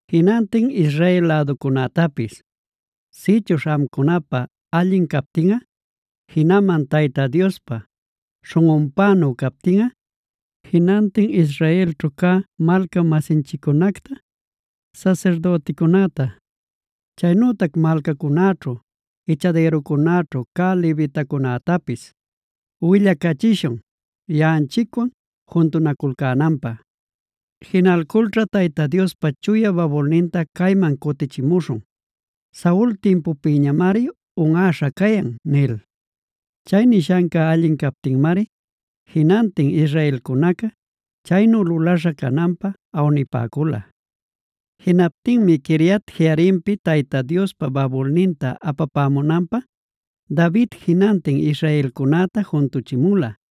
jinantin Israel läducunätapis: “Sïchuśh amcunapä allin captinꞌa, jinaman Tayta Diospä śhunꞌunpänu captinꞌa, jinantin Israelćhu cä malca-masinchiccunacta, sasirdüticunäta, chaynütac malcancunaćhu ichadïruncunaćhu cä levitacunätapis, willacachishun yaꞌanchicwan juntunaculcänanpä. Jinalculćha Tayta Diospa chuya babulninta cayman cutichimuśhun. Saul timpupïñamari unꞌäśha cayan” nil. Chay nishanca allin captinmari jinantin israelcunaca chaynu lulaśha cananpä awnipäcula. Jinaptinmi Quiriat-jearimpi Tayta Diospa babulninta apapämunanpä, David jinantin israelcunäta juntuchimula,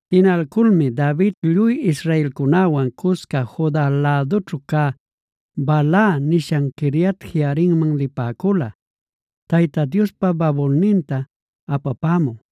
Jinalculmi David lluy israelcunäwan cusca Juda lädućhu cä Baala nishan Quiriat-jearimman lipäcula, Tayta Diospa babulninta apapämü.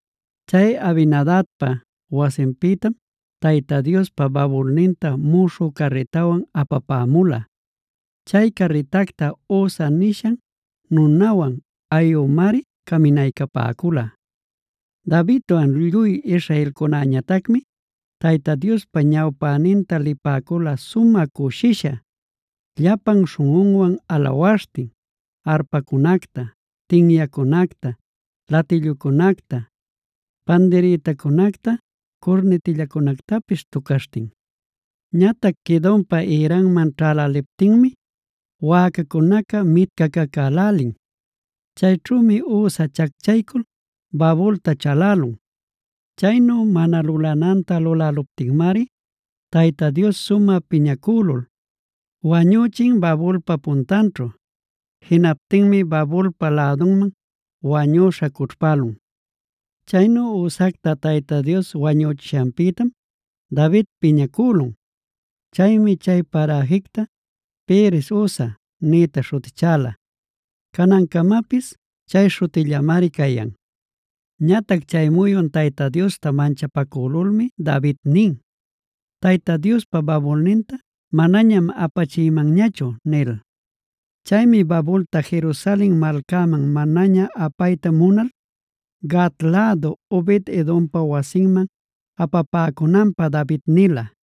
Chay Abinadabpa wasinpïtam Tayta Diospa babulninta muśhü carritawan apapämula. Chay carritacta Uza nisha nunawan Ahiomari caminaycapäcula. Davidwan lluy israelcunäñatacmi Tayta Diospa ñawpäninta lipäcula sumä cushisha, llapan śhunꞌunwan alawaśhtin arpacunacta, tinyacunacta, latillucunacta, pandirïtacunacta, curnitillacunactapis tucaśhtin. Ñatac Quidonpa ïranman ćhäläliptinmi wäcacunaca mitcacacälälin. Chayćhümi Uza chacchaycul babulta chalälun. Chaynu mana lulananta luläluptinmari Tayta Dios sumä piñacülul, wañüchin babulpa puntanćhu. Jinaptinmi babulpa lädunman wañüśha cućhpälun. Chaynu Uzacta Tayta Dios wañüchishanpïtam David piñacülun. Chaymi chay paräjicta Perez-uzac nïta śhutichäla. Canancamapis chay śhutillamari cayan. Ñatac chay muyun Tayta Diosta manchapacülulmi David nin: “Tayta Diospa babulninta manañam apachïmanñachu” nil. Chaymi babulta Jerusalen malcanman manaña apayta munal, Gat lädu Obed-edompa wasinman apapäcunanpä David nila.